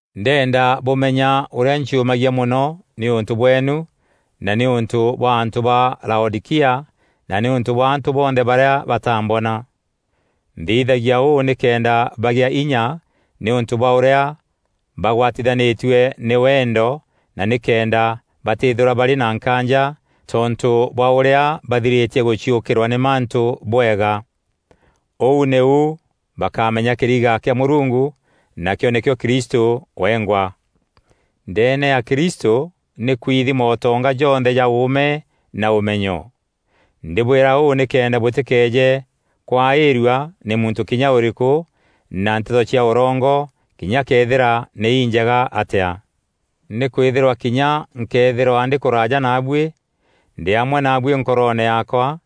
Ndenda bûmenya ûrîa nciûmagia mono nîûntû bweenu na nîûntû bwa antû ba Laodîkia na nîûntû bwa antû bonthe barîa bataambona. Nthithagia ûû nîkenda bagea inya nîûntû bwa ûrîa bagwatithanîtue nî wendo na nîkenda batîthîrwa barî na nkaanja tontû bwa ûrîa bathirîtie gûciûkîrwa nî mantû bwega. Ûu nîu bakamenya kîriga kîa Mûrungu, nakîo nîkîo Kristû wengwa. Ndeene ya Kristû nî kwithi mootonga jonthe ja ûûme na ûmenyo. Ndîbwîra ûû nîkenda bûtîkeeje kwaîrua nî muntû kinya ûrîkû na nteto cia ûrongo kinya këethîra nî injega atîa. Nîkwîthîrwa kinya nkëethîrwa ndî kûraaja naabuî, ndî amwe naabuî nkoroone yaakwa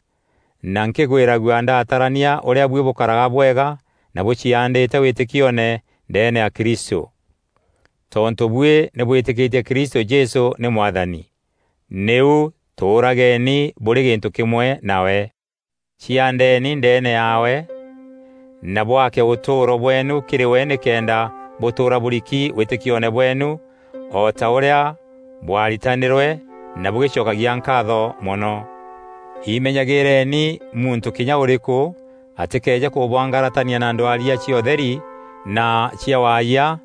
na nkîgwîragua ndatarania ûrîa buî bûkaraga bwega na bûciaandîte wîtîkione ndeene ya Kristû. Tontû buî nî bwîtîkîtie Kristû Jesû nî Mwathani, nîu tûûrageni bûrî gîntû kîmwe nawe. Ciandeeni ndeene yaawe na bwake ûtûûro bweenu kîrî we nîkenda bûtûûra bûriki wîtîkioone bweenu o ta ûrîa bwaaritanîrwe na bûgîcokagia nkaatho mono. Imenyagîîreni muntû kinya ûrîkû atîkeeje kûbwangaratania na ndwaria cia ûtheri na cia waayia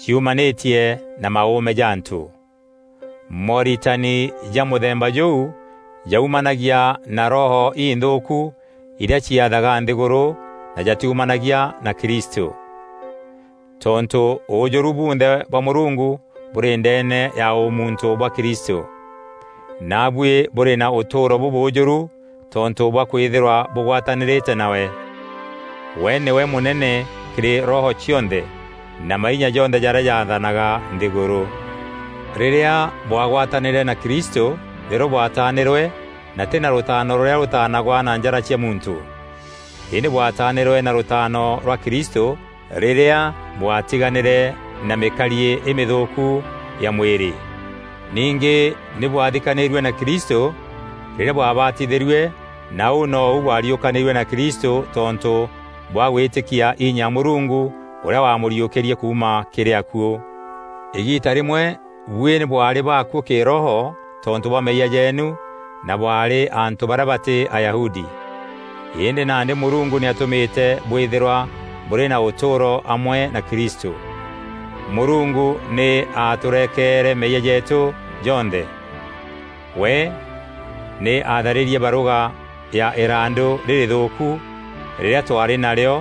ciumanîtie na maûûme ja antû. Mooritani ja mûthemba jûu jaumanagia na roho inthûûku irîa ciathaga nthîgûrû na jatiumanagia na Kristû. Tontû ûûjûru bunthe bwa Mûrungu bûrî ndeene ya ûmuntû bwa Kristû, naabuî bûrî na ûtûûro bûbûûjûru tontû bwa kwîthîrwa bûgwatanîrîte nawe. We nîwe mûnene kîrî roho cionthe na mainya jonthe jarîa jathanaga nthîgûrû. Rîrîa bwagwatanîre na Kristû nîrîo bwatanîrwe na tî na rûtaano rûrîa rûtanagwa na njara cia muntû. Îndî bwatanîrwe na rûtaano rwa Kristû rîrîa bwatiganîre na mîkariî îmînthûûku ya mwîrî. Ningî nî bwathikanîrue na Kristû rîrîa bwabatithîrue na ûu nou bwariûkanîrue na Kristû tontû bwa gwîtîkia inya ya Mûrungu ûrîa wamûriûkîrie kuuma kîrî akuû. Îgiita rîmwe buî nî bwaarî baakuû kîroho tontû bwa meeyia jeenu na bwaarî antû barîa batî Ayahudi. Îndî nandî Mûrungu nî atûmîte bwîthîrwa bûrî na ûtûûro amwe na Kristû. Mûrungu nî aatûrekeere meeyia jeetû jonthe. We nî aatharîrie barûga ya îrandu rîrîthûûku rîrîa twaarî narîo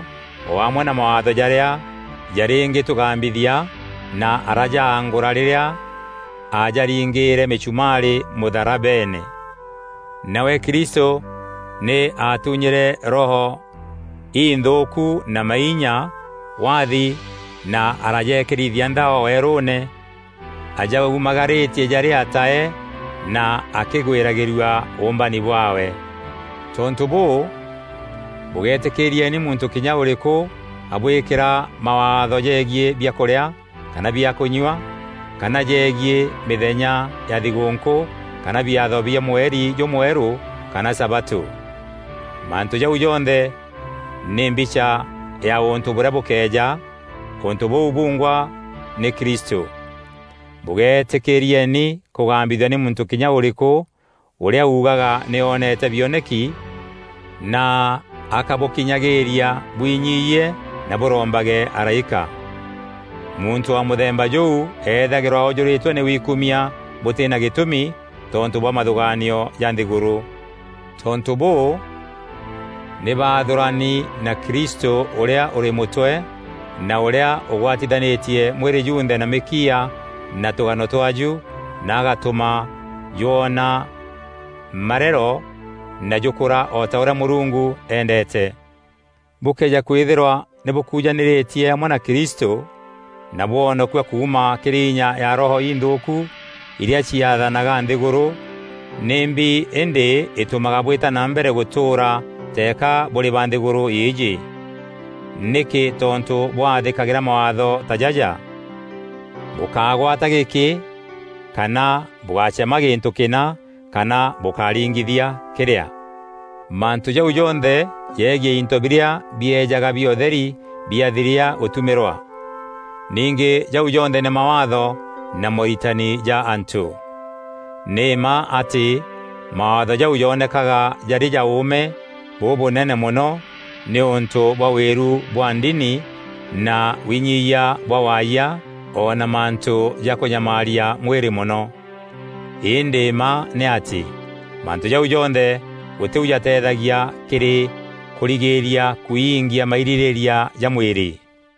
o amwe na mawaatho jarîa jarîngîtûgambithia na arajangûra rîrîa ajaringîîre mîchumaarî mûtharabeene. Nawe Kristû nî aatunyîre roho inthûûku na mainya waathi na arajekîrithia nthao weerûûne ajaumagarîtie jarî atae na akîgwîragîrua ûûmbani bwaawe. Tontû bûû, bûgeetîkîrieni muntû kinya ûrîkû abwîkîra mawaatho jegiî biakûrîa kana biakûnyua kana jegiî mîthenya ya thigûûnkû kana biatho bia mweri jûmwerû kana sabatû. Mantû jau jonthe nî mbicha ya ûntû bûrîa bûkeeja; ûntû bûu bungwa nî Kristû. Bûgeetîkîrieni kûgambithua nî muntû kinya ûrîkû ûrîa ûgaga nî oonete bioneki na akabûkinyagîîria bwinyiyie na bûrombage araîka. Muntû wa mûthemba jûu eethagîrwa oojûrîtwe nî wikumia bûtî na gîtûmi tontû bwa mathûgaanio ja nthîgûrû. Tontû bûû, nî baathûrani na Kristû ûrîa ûrî mûtwe na ûrîa ûgwatithanîtie mwîrî junthe na mîkiia na tûgano twaju na agatûma jwoona marero na jûkûra o ta ûrîa Mûrungu endete. Bûkëeja kwîthîrwa nî bûkujanîrîtie amwe na Kristû na bwonokua kuuma kîrî inya ya roho inthûûku irîa ciathanaga nthîgûrû, nîmbi îndî îtûmaga bwîta na mbere gûtûûra teeka bûrî ba nthîgûrû îîjî? Nîkî tontû bwathîkagîra mawaatho ta jaja: “Bûkágwata gîkî,” kana “Bûgácema gîntû kîna,” kana “Bûkáringithia kîrîa.” Mantû jau jonthe jegiî into birîa biejaga bia ûtheri biathiria gûtumîrwa. Ningî jau jonthe nî mawaatho na mooritani ja antû. Nî mma atî mawaatho jau jonekaga jarî ja ûûme bûbûnene mono nîûntû bwa wîru bwa ndini na winyiyia bwa waayia o na mantû ja kûnyamaaria mwîrî mono. Îndî mma nî atî, mantû jau jonthe gûtî u jateethagia kîrî kûrigîîria kwiingia mairîrîîria ja mwîrî.